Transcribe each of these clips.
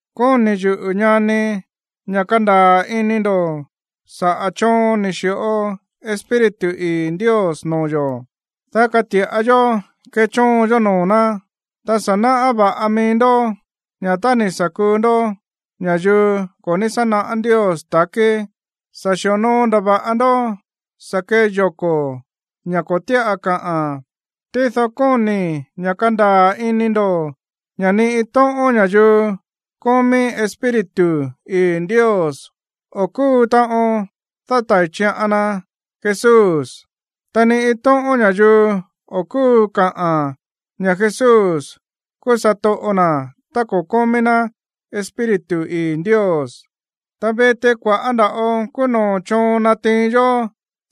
Kóni̱ yuꞌu̱, ñani, ña̱ kandaa̱ ini ndo̱ saꞌa̱ choon ni̱ xi̱ꞌo Espíritu ii̱ Ndios noo̱ yo̱, dá kati̱ꞌa yó kechóon yó noo̱ ná. Ta sa̱ náꞌá va̱ꞌa mií ndó ña̱ tá ni̱ sa̱ kuu ndó ña̱yuu ko̱ ní sá naꞌá Ndios ta̱kí, sa̱ xi̱onoo ndava̱ꞌa ndó sa̱ kee yoko̱, ña̱ ko̱ tíꞌa káꞌa̱n. Tído kóni̱i̱ ña̱ kandaa̱ ini ndo̱ ña̱ ni iin tóꞌón ña̱yuu kómí Espíritu ii̱ Ndios o̱ kúu taꞌon dátai̱ chiꞌan na Jesús. Ta ni iin tóꞌón ña̱yuu o̱ kúu kaꞌa̱n ña̱ Jesús kúú satoꞌo na̱ tá ko̱ kómí ná Espíritu ii̱ Ndios. Ta viti, kua̱ꞌá nda̱ꞌo kúú noo̱ choon nátiin yó,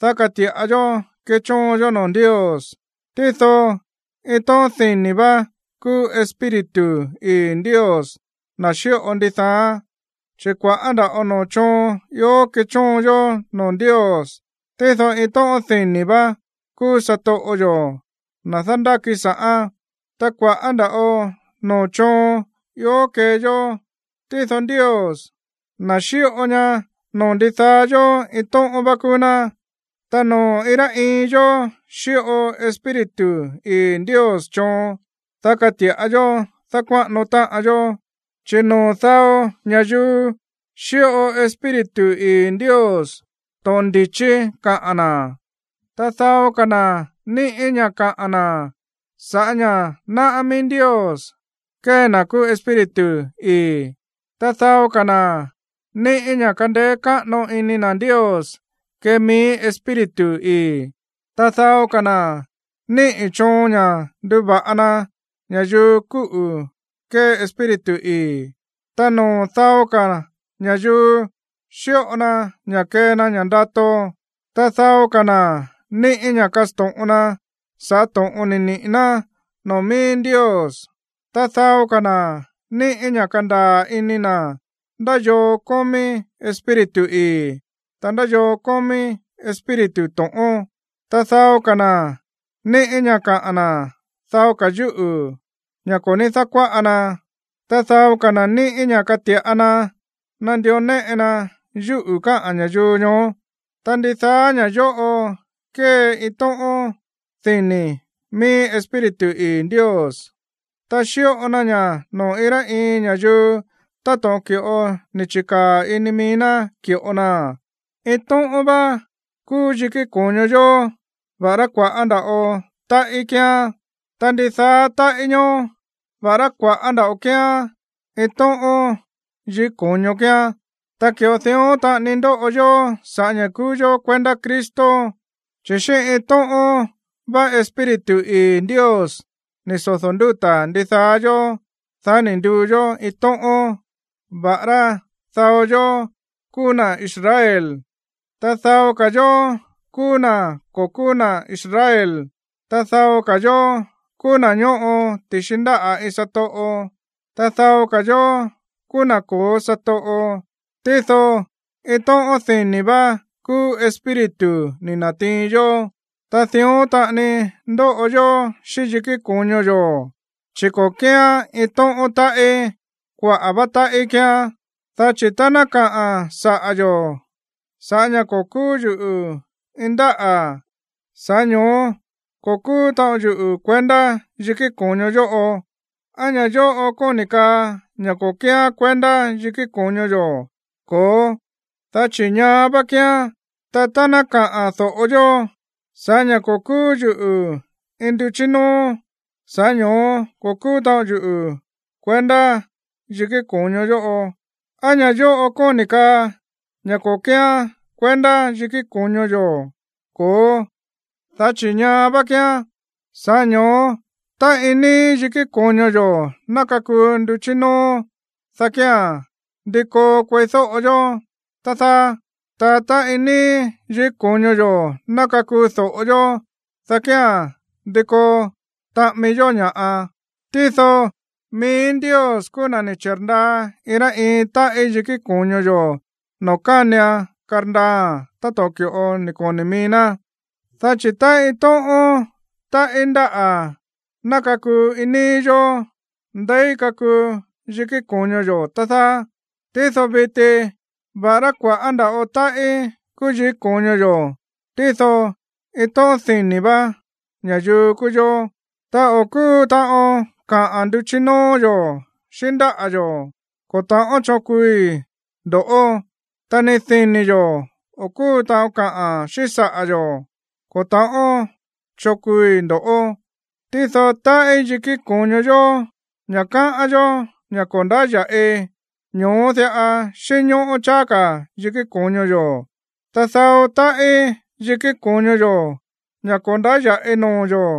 dá kati̱ꞌa yó kechóon yó noo̱ Ndios, tído iin tóꞌón dini̱ vá kúú Espíritu ii̱ Ndios, na̱ xíꞌo ndidaáán. Chi̱ kua̱ꞌá nda̱ꞌo noo̱ choon ió kéchóon yó noo̱ Ndios, tído iin tóꞌón dini̱ vá kúú satoꞌo yo̱, na̱ dándáki sa̱ꞌán. Ta kua̱ꞌá nda̱ꞌo noo̱ choon ió kée yó, tído Ndios, na̱ xíꞌo ña noo̱ ndidaá yó, iin tóꞌón vá kúú ná. Ta noo̱ iin rá iin yó xíꞌo Espíritu ii̱ Ndios choon, dá kati̱ꞌa yó dákuáꞌano táꞌan yó. Chi̱ noo̱ dao ña̱yuu xíꞌo Espíritu ii̱ Ndios to̱ꞌon ndi̱chí kaꞌa̱n na̱, ta dao ka̱ na̱ níꞌi̱ ña̱ kaꞌa̱n na̱ sa̱ꞌá ña̱ náꞌá mií Ndios kée na̱ kúú Espíritu ii̱. Ta dao ka̱ na̱ níꞌi̱ ña̱ kandeé káꞌano ini na̱ Ndios kée mií Espíritu ii̱, ta dao ka̱ na̱ níꞌi̱ choon ña̱ nduva̱ꞌa na ña̱yuu kúꞌu̱ kée Espíritu ii̱. Ta noo̱ dao ka̱ ña̱yuu xíꞌo na ña̱ kee na ña̱ꞌa ndato, ta dao ka̱ na̱ níꞌi̱ ña̱ kasto̱ꞌon na sa̱ꞌá to̱ꞌon ni̱ niꞌi̱ ná noo̱ mií Ndios. Ta dao ka̱ na̱ níꞌi̱ ña̱ kandaa̱ ini na̱ ndá yoo kómí Espíritu ii̱, ta ndá yoo kómí espíritu to̱ꞌón. Ta dao ka̱ na̱ níꞌi̱ ña̱ kaꞌa̱n na̱ dao ka̱ yúꞌu̱, ña̱ ko̱ ní dákuáꞌa na. Ta dao ka̱ na̱ níꞌi̱ ña̱ kati̱ꞌa na nandió néꞌe na yúꞌu̱ káꞌa̱n ña̱yuu ñoó. Ta ndidaá ña̱ yóꞌo kée iin tóꞌón dini̱ mií Espíritu ii̱ Ndios. Ta xíꞌo na ña̱ noo̱ iin rá iin ña̱yuu táto̱ꞌon ki̱ꞌo ni̱ chi̱kaa̱ ini mií ná ki̱ꞌo naa̱n. Iin tóꞌón vá kúú yikí ko̱ño yo̱, va̱ꞌará kua̱ꞌá nda̱ꞌo táꞌí kíán. Ta ndidaá táꞌí ñoó, va̱ꞌará kua̱ꞌá nda̱ꞌo kíán, iin tóꞌón yikí ko̱ño kíán. Ta ki̱ꞌo dión taꞌani ndóꞌo yó sa̱ꞌá ña̱ kúú yó kuendá Cristo, chi̱ xíꞌín iin tóꞌón vá Espíritu ii̱ Ndios ni̱ sodo̱ ndúta̱ ndidaá yó, dá ni̱ nduu yó iin tóꞌón, va̱ꞌará dao yó kúú na̱ Israel, ta dao ka̱ yó kúú na̱ ko̱ kúú na̱ Israel, ta dao yó kúú na̱ ñóꞌo ti̱xi ndáꞌa̱ iin satoꞌo, ta dao ka̱ yó kúú na̱ ko̱ó satoꞌo. Tído iin tóꞌón dini̱ vá kúú Espíritu ni̱ na̱tiin yó. Ta dión taꞌani ndóꞌo yó xíꞌín yikí ko̱ño yo̱, chi̱ ko̱ kíán iin tóꞌón táꞌí, kuaꞌa̱ vá táꞌí kíán. Dá chi̱ tá ná kaa saꞌa̱ yo̱: “Sa̱ꞌá ña̱ ko̱ kúú yuꞌu̱ iin ndáꞌa̱, sa̱ꞌá ño̱ó ko̱ kúú taꞌon yuꞌu̱ kuendá yikí ko̱ño yóꞌo”, ¿á ña̱ yóꞌo kóni̱ kaa ña̱ ko̱ kíán kuendá yikí ko̱ño yo̱? Ko̱ó, dá chi̱ ñaá vá kíán. Ta tá ná kaa do̱ꞌo yó: “Sa̱ꞌá ña̱ ko̱ kúú yuꞌu̱ iin nduchí nóó, sa̱ꞌá ño̱ó ko̱ kúú taꞌon yuꞌu̱ kuendá yikí ko̱ño yóꞌo”, ¿á ña̱ yóꞌo kóni̱ kaa ña̱ ko̱ kíán kuendá yikí ko̱ño yo̱? Ko̱ó, dá chi̱ ñaá vá kíán. Sa̱ꞌá ño̱ó tá iin níí yikí ko̱ño yo̱ ná kakuu nduchí nóó, dá kía̱n, ¿ndi koo kueídóꞌo yó, tá dáá? Ta tá iin níí yikí ko̱ño yo̱ ná kakuu do̱ꞌo yó, dá kía̱n, ¿ndi koo taꞌami yó ña̱ꞌa? Tído mií Ndios kúú na̱ ni̱ chi̱rndaa iin rá iin táꞌí yikí ko̱ño yo̱ noo̱ kánian karndaaa̱n táto̱ꞌon ki̱ꞌo ni̱ koni̱ mií ná. Dá chi̱ tá iin tóꞌón táꞌí ndáꞌa̱ ná kakuu iin níí yó, ¿ndeí kakuu yikí ko̱ño yo̱, tá dáá? Tído viti, va̱ꞌará kua̱ꞌá nda̱ꞌo táꞌí kúú yikí ko̱ño yo̱, tído iin tóꞌón dini̱ vá ña̱yuu kúú yó. Ta o̱ kúu taꞌon kaꞌa̱n nduchí nóó yo̱ xíꞌín ndáꞌa̱ yo̱: “Ko̱ ta̱ꞌón choon kuui ndo̱ꞌó.” Ta ni dini̱ yo̱, o̱ kúu taꞌon kaꞌa̱n xíꞌín saꞌa̱ yo̱: “Ko̱ ta̱ꞌón choon kuui ndo̱ꞌó.” Tído táꞌí yikí ko̱ño yo̱, ña̱ káꞌán yó ña̱ ko̱ ndáya̱ꞌi, ñoó diꞌa xínñóꞌó cháá ka̱ yikí ko̱ño yo̱. Ta dao táꞌí yikí ko̱ño yo̱, ña̱ ko̱ ndáya̱ꞌi noo̱ yo̱,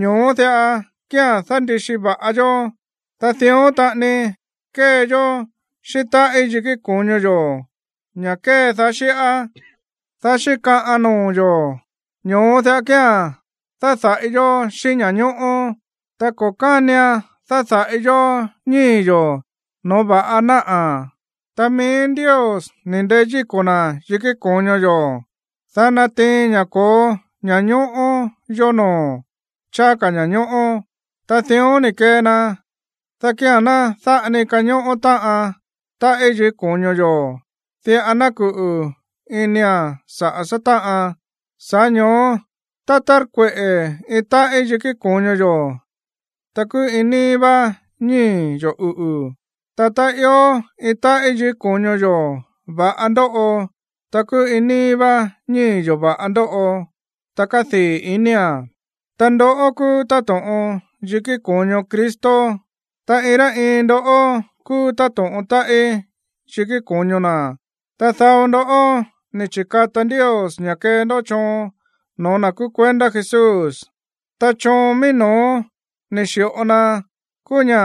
ñoó diꞌa kía̱n dándi̱xi va̱ꞌa yó. Ta dión taꞌani kée yó xíꞌín táꞌí yikí ko̱ño yo̱, ña̱ kédaá xíꞌá, dá xíkaꞌan noo̱ yo̱, ño̱ó diꞌa kía̱n dáda̱ꞌi yó xíꞌín ña̱ñóꞌó. Ta ko̱ kánian dáda̱ꞌi yó ñíi̱ yo̱ no̱ó va̱ꞌa náꞌa̱. Ta mií Ndios ni̱ ndeyíko̱ na̱ yikí ko̱ño yo̱, dá natiin ña̱ ko̱ó ña̱ñóꞌó yó noo̱, cháá ka̱ ña̱ñóꞌó. Ta dión ni̱ kee na, dá kía̱n ná dáꞌa ni kañóꞌó táꞌan táꞌí yikí ko̱ño yo̱, diꞌa ná kuꞌu̱ inia̱n saꞌa̱ sátáꞌan. Sa̱ꞌá ño̱ó tá tárkueꞌe̱ iin táꞌí yikí ko̱ño yo̱, ta kúú iin níí vá ñíi̱ yo̱ uꞌu̱. Ta tá ió iin táꞌí yikí ko̱ño yo̱ va̱ꞌa ndóꞌo, ta kúú iin níí vá ñíi̱ yo̱ va̱ꞌa ndóꞌo, ta kádii̱ inía̱n. Ta ndoꞌó kúú táto̱ꞌon yikí ko̱ño Cristo, ta iin rá iin ndó kúú táto̱ꞌon táꞌí yikí ko̱ño na̱. Ta dao ndó ni̱ chi̱kata Ndios ña̱ kee ndó choon no̱ó na̱ kúú kuendá Jesús. Ta choon mií no̱ó ni̱ xi̱ꞌo na kúú ña̱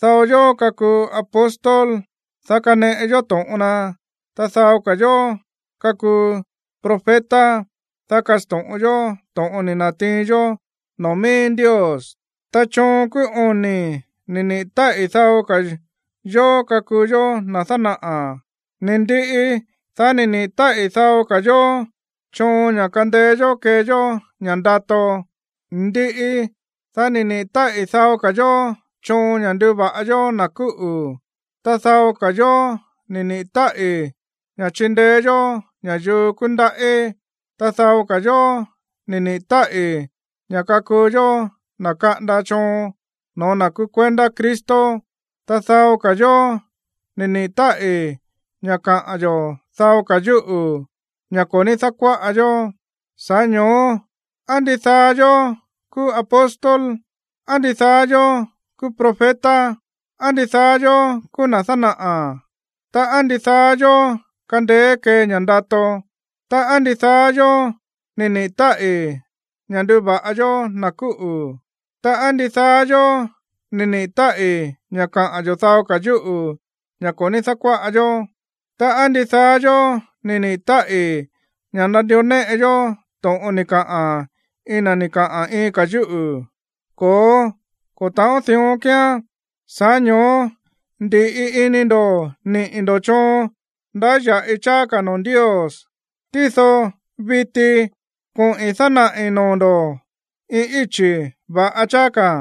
dao yó kakuu apóstol, dá kaneꞌe yó to̱ꞌon na, ta dao ka̱ yó kakuu profeta, dá kasto̱ꞌon yó to̱ꞌon ni̱ na̱tiin yó noo̱ mií Ndios. Ta choon kúú oni̱ ni̱ niꞌi̱ táꞌi̱ dao ka̱ yó kakuu yó na̱ dánaꞌa̱. Ni̱ ndiꞌi, dá ni̱ niꞌi̱ táꞌi̱ dao ka̱ yó choon ña̱ kandeé yó kee yó ña̱ꞌa ndato. Ndiꞌi, dá ni̱ niꞌi̱ táꞌi̱ dao ka̱ yó choon ña̱ nduva̱ꞌa yó na̱ kúꞌu̱. Ta dao ka̱ yó ni̱ niꞌi̱ táꞌi̱ ña̱ chindeé yó ña̱yuu kúndaꞌí. Ta dao ka̱ yó ni̱ niꞌi̱ táꞌi̱ ña̱ kakuu yó na̱ kaꞌanda choon no̱ó na̱ kúú kuendá Cristo. Ta dao ka̱ yó ni̱ niꞌi̱ táꞌi̱ ña̱ kaꞌa̱n yo̱ dao ka̱ yúꞌu̱, ña̱ ko̱ ní dákuáꞌa yó. Sa̱ꞌá ño̱ó, ¿á ndidaá yó kúú apóstol? ¿Á ndidaá yó kúú profeta? ¿Á ndidaá yó kúú na̱ dánaꞌa̱? Ta, ¿á ndidaá yó kándéé kée ña̱ꞌa ndato? Ta, ¿á ndidaá yó ni̱ niꞌi̱ táꞌi̱ ña̱ nduva̱ꞌa yó na̱ kúꞌu̱? Ta, ¿á ndidaá yó ni̱ niꞌi̱ táꞌi̱ ña̱ kaꞌa̱n yo̱ dao ka̱ yúꞌu̱, ña̱ ko̱ ní dákuáꞌa yó? Ta, ¿á ndidaá yó ni̱ niꞌi̱ táꞌi̱ ña̱ nandió néꞌe yó to̱ꞌon ni̱ kaꞌa̱n iin na̱ ni̱ kaꞌa̱n iin ka̱ yúꞌu̱? Ko̱ó, ko̱ ta̱ꞌón dión kíán. Sa̱ꞌá ño̱ó ndi̱ꞌi ini ndo̱ niꞌi̱ ndo̱ choon ndáya̱ꞌi cháá ka̱ noo̱ Ndios. Tído viti koꞌi̱n dánaꞌi̱ noo̱ ndo̱ iin íchi̱ va̱ꞌa cháá ka̱.